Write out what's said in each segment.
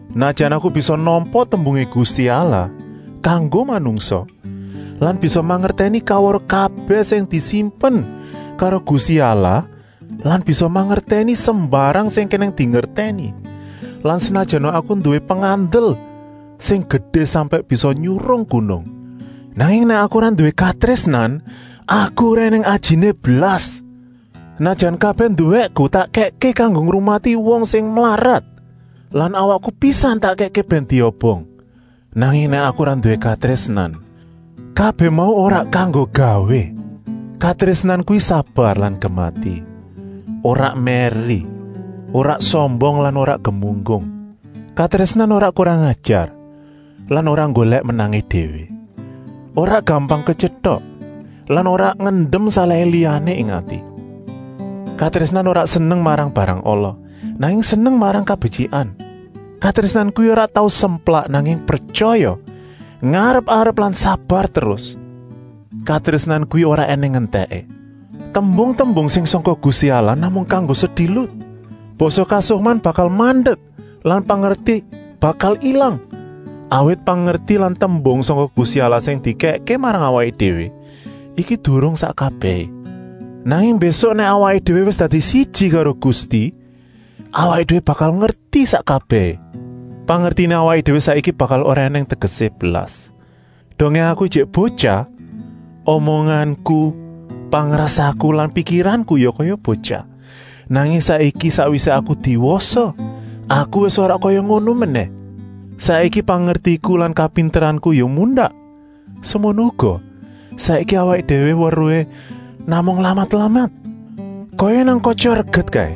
Senajan aku bisa nampa tembungé Gusti Allah kanggo manungsa lan bisa mangertèni kaweruh kabèh sing disimpen karo Gusti Allah lan bisa mangertèni sembarang sing kenèng dingertèni lan senajana aku nduwé pengandel sing gedé sampèk bisa nyurung gunung, nanging nèk aku ora nduwé katrésnan, aku ora ènèng ajiné blas. Senajan kabèh nduwéku tak kèkké kanggo ngrumati wong sing mlarat lan awakku pisan tak kèkké bèn diobong, nanging nèk aku ora nduwé katrésnan, kabèh mau ora kanggo gawé. Katrésnan kuwi sabar lan gemati, ora mèri, ora sombong lan ora gemunggung. Katrésnan ora kurang-ajar lan ora nggolèk menangé déwé; ora gampang ketyentok lan ora ngendem salahé liyané ing ati. Katrésnan ora seneng marang barang ala, nanging seneng marang kabetyikan. Katrésnan kuwi ora tau semplak, nanging pretyaya, ngarep-arep lan sabar terus. Katrésnan kuwi ora ènèng entèké. Tembung-tembung sing sangka Gusti Allah namung kanggo sedilut, basa kasukman bakal mandek lan pangerti bakal ilang. Awit pangerti lan tembung sangka Gusti Allah sing dikèkké marang awaké déwé iki durung sak kabèhé, nanging mbésuk nèk awaké déwé wis dadi siji karo Gusti, awaké déwé bakal ngerti sak kabèhé. Pangertiné awaké déwé saiki bakal ora ènèng tegesé blas. Dongé aku ijik botyah, omonganku, pangrasaku lan pikiranku ya kaya botyah. Nanging saiki, sakwisé aku diwasa, aku wis ora kaya ngono menèh. Saiki pangertiku lan kapinteranku ya mundak. Semono uga, saiki awaké déwé weruhé namung lamat-lamat, kaya nang katya reget kaé.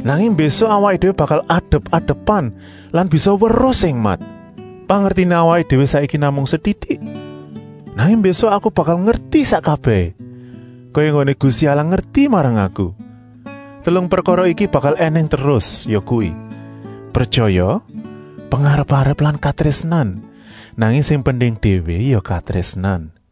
Nanging mbésuk awaké déwé bakal adep-adepan lan bisa weruh sing mat. Pangertiné awaké déwé saiki namung setitik, nanging mbésuk aku bakal ngerti sak kabèhé, kaya enggoné Gusti Allah ngerti marang aku. Telung prekara iki bakal ènèng terus, yakuwi: pretyaya, pengarep-arep lan katrésnan. Nanging sing penting déwé ya katrésnan.